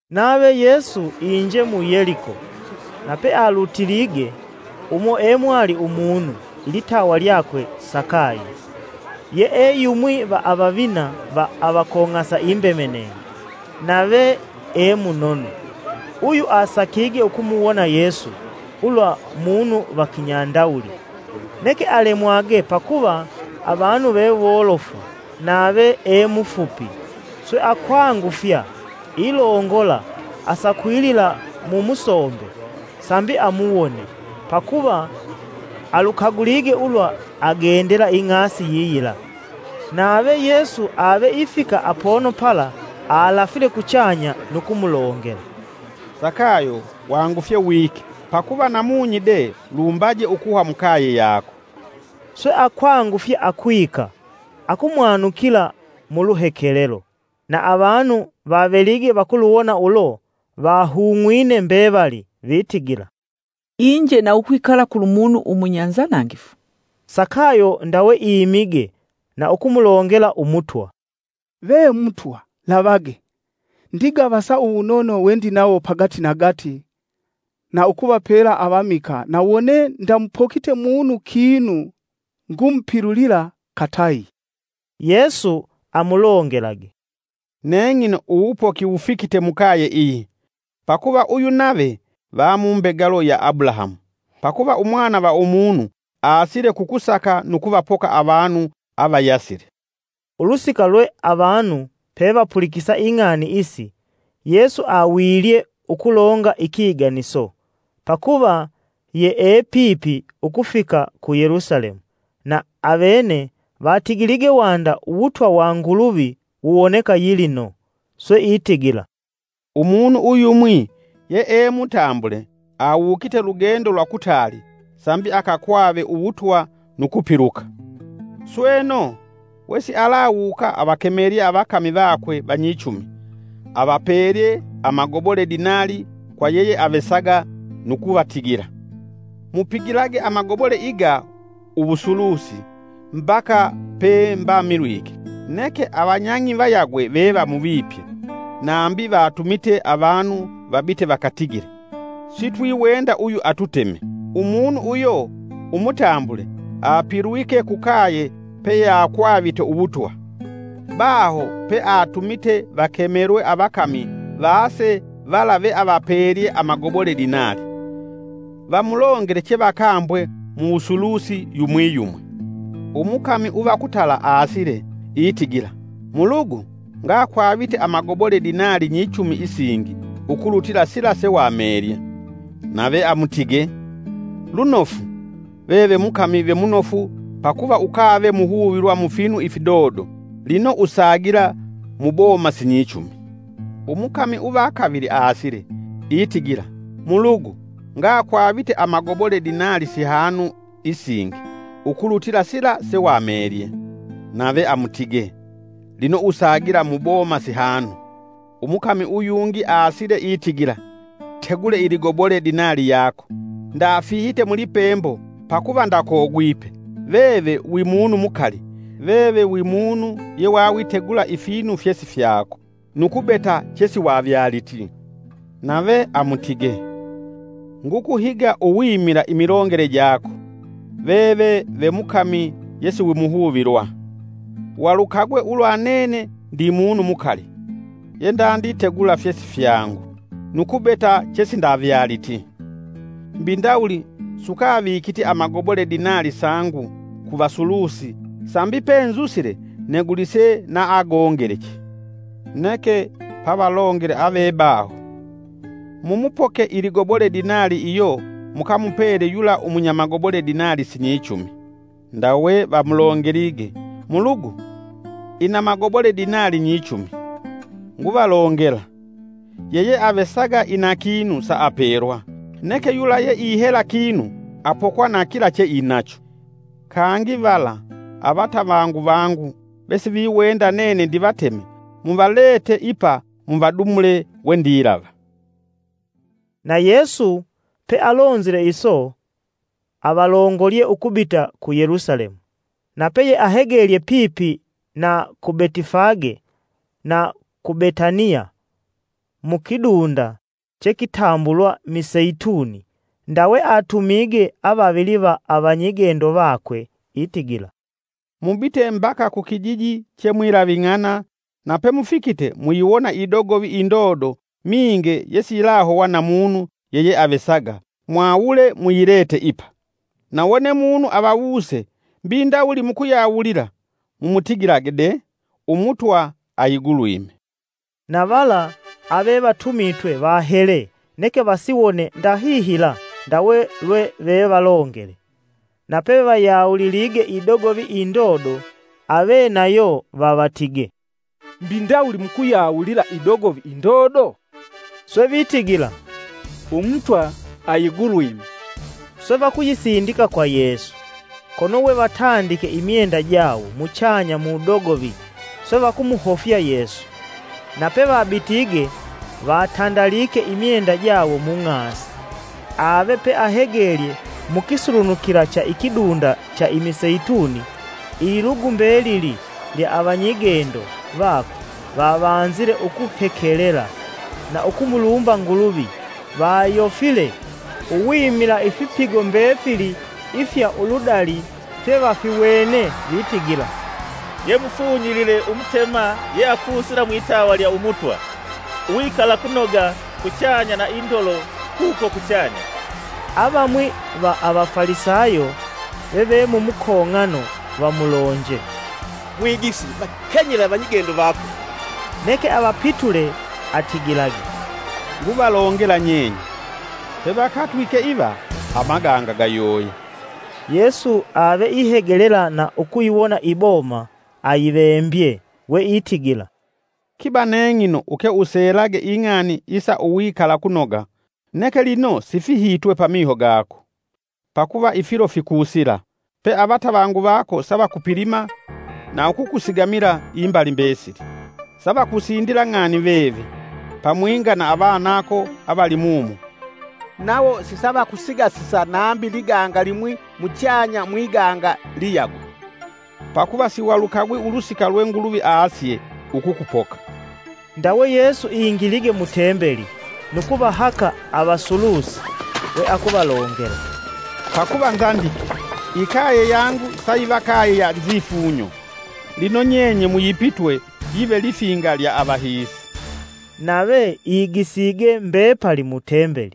Nave Yesu inje mu Yeliko, na pealutilige, umo e mwali umunu, ilitawa lyakwe Sakayo. Yee yumwi va avavina va avakong'asa imbemenenge nave e munono. Uyu asakige ukumuwona Yesu ulwa munu va kinyandawuli, neke alemwage pakuva avanu ve wolofu nave e mufupi. Swe akwangufya ilongola asakwilila mu musombe sambi amuwone, pakuva alukagulige ulwa agendela ing'asi yiyila. Nave Yesu ave ifika apono pala, alafile kuchanya nu kumulongela, “Sakayo wangufye wike, pakuva namunyi de lumbaje ukuhwa mukaye yako.” Swe akwangufya akwika, akumwanukila mu luhekelelo. Na avanu vavelige vakuluwona ulo, vahung'wine mbevali vitigila, “Inje na ukwikala kulu munu umunya nzanangifu.” Sakayo ndawe imige na ukumulongela Umutwa! “Ve Mutwa, Lavage! Ndigavasa uwunono wendinawo pagati nagati na ukuvapela Avamikaa na wone ndamupokite munu kinu ngumupilulila katayi.” Yesu amulongelage, “Neng'ino uwupoki wufikite mukaye iyi, pakuva uyu nave va mumbegalo ya Abulahamu. Pakuva Umwana va Umunu aasile kukusaka nu kuvapoka avanu avayasile.” Ulusika lwe avanu pevapulikisa ing'ani isi, Yesu awilye ukulonga ikiganiso. (Pakuva yee pipi ukufika ku Yelusalemu, na avene vatigilige wanda uwutwa wa Nguluvi wuwoneka yilino.) Swe itigila, “Umunu uyumwi yee mutambule awukite lugendo lwa kutaali sambi akakwave uwutwa nu kupiluka. Sweno, wesialawuka, avakemelye avakami vakwe vanyichumi, avapelye amagobole dinali kwa yeyeavesaga nu kuvatigila, ‘Mupigilage amagobole iga uwusulusi mbaka pe mbamilwike.’ Neke avanyang'i vayagwe vevamuvipye; nambi vatumite avanu vabite vakatigile, ‘Sitwiwenda uyu atuteme.’ “Umunu uyo umutambule apilwike kukaye peyeakwavite uwutwa. Baho peatumite vakemelwe avakami vase vala vealavapelye amagoboledinali, vamulongele chevakambwe mu wusulusi yumwi yumwi. Umukami uva kutala aasile, itigila, ‘Mulugu, ngakwavite amagobole dinali nyichumi isingi ukulutila sila sewapelye.’ Nave amutige: ‘Lunofu, veve mukami ve munofu pakuva ukave muhuvilwa mufinu ifidodo, lino usagila muboma sinyichumi!’ Umukami uva kavili aasile, itigila, ‘Mulugu, ngakwavite amagobole dinali sihanu isingi ukulutila sila sewapelye.’ Nave amutige, ‘Lino usagila muboma sihanu.’ “Umukami uyungi aasile itigila, ‘Tegule iligobole dinali yako, ndafihite mulipembo, pakuva ndakogwipe, veve wi munu mukali. Veve wi munu yewawitegula ifinu fyesifyako, nu kubeta chesiwavyaliti.’ Nave amutige, ‘Ngukuhiga uwimila imilongele jako, veve ve mukami yesiwimuhuvilwa! Valukagwe ulwa nene ndi munu mukali, yendanditegula fyesifyangu nu kubeta chesindavyaliti. Mbi ndawuli sukavikiti amagobole dinali sangu ku vasulusi sambi penzusile negulise na agongeleche?’ Neke pavalongele avebaho, ‘Mumupoke iligobole dinali iyo mukamupele yula umunya magobole dinali sinyichumi.’ Ndawe vamulongelige: ‘Mulugu, ina magobole dinali nyichumi!’ Nguvalongela: ‘Yeyevesaga ina kinu saapelwa. Neke yula yeihela kinu apokwa na kila che inacho. Kangi vala, avatavangu vangu vesiviwenda nene ndivateme muvalete ipa muvadumule wendilava.’” Na Yesu pealonzile iso, avalongolye ukubita ku Yelusalemu. Nape yeahegelye pipi na ku Betifage na ku Betaniya, mukidunda chekitambulwa Miseituni, ndawe atumige avavili va avanyigendo vakwe itigila, “Mubite mbaka kukijiji che mwilaving'ana na pemufikite muyiwona idogovi indodo minge yesiyilahowa na munu yeyeavesaga, mwawule muyilete ipa. Na wone munu avawuse mbi ndawuli mukuyawulila, mumutigilage de Umutwa ayigulwime.” Na vala avevatumitwe vahele neke vasiwone ndahihila ndawe lwe vevalongele. Na pevayawulilige idogovi indodo, avenayo vavatige, “Mbi ndawuli mukuyawulila idogovi indodo?” Swe vitigila, “Umutwa ayigulwime” Swe vakuyisindika kwa Yesu. kono we vatandike imyenda jawo muchanya mudogovi swe vakumuhofya Yesu. Na pevabitige vatandalike imyenda jawo mung'asi. Ave peahegelye mukisulunukila cha ikidunda cha Imiseituni, ililugu mbelili lya avanyigendo vakwe, vavanzile ukuhekelela na ukumulumba Nguluvi vayofile, uwimila ifipigo mbefili ifya uludali fye vafiwene; vitigila, “Ye mufunyilile Umutema yeakusila mwitawa lya Umutwa. Uwikalakunoga kuchanya na indolo kuko kuchanya!” Avamwi va Avafalisayo veve mu mukong'ano vamulonje, “Mwigisi vakenyele avanyigendo vako!” Neke avapitule atigilage, “Nguvalongela nyenye, pevakatwike iva amaganga gayoya.” Yesu aveihegelela na ukuyiwona i muboma, ayivembye weitigila, “Kiba neng'ino uke uselage ing'ani isa uwikalakunoga! Neke lino sifihitwe pamiho gako. Pakuva ifilo fikusila pe avatavangu vako savakupilima na ukukusigamila imbali mbesili. Savakusindila ng'ani veve, pamwinga na avanako avali mumo. Nawo sisavakusigasisa nambi liganga limwi muchanya mwiganga liyagwe, pakuva siwalukagwi ulusika lwe Nguluvi asye ukukupoka.” Ndawe Yesu ingilige mu tembeli, nu kuvahaka avasulusi we akuvalongela, “Pakuva nzandike, ‘Ikaye yangu sayiva kaye ya nzifunyo.’ Lino nyenye muyipitwe yive lifinga lya avahiisi.” Nave igisige mbepali mu tembeli.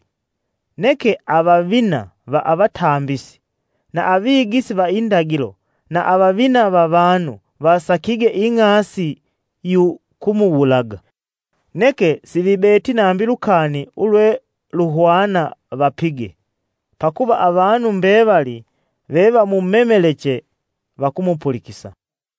Neke avavina va avatambisi, na avigisi va indagilo, na avavina va vanu vasakige ing'asi yu kumuwulaga, Neke sivibeti nambi lukani ulwe vevahwana vapige, pakuva avanu mbevali vevamumemeleche vakumupulikisa.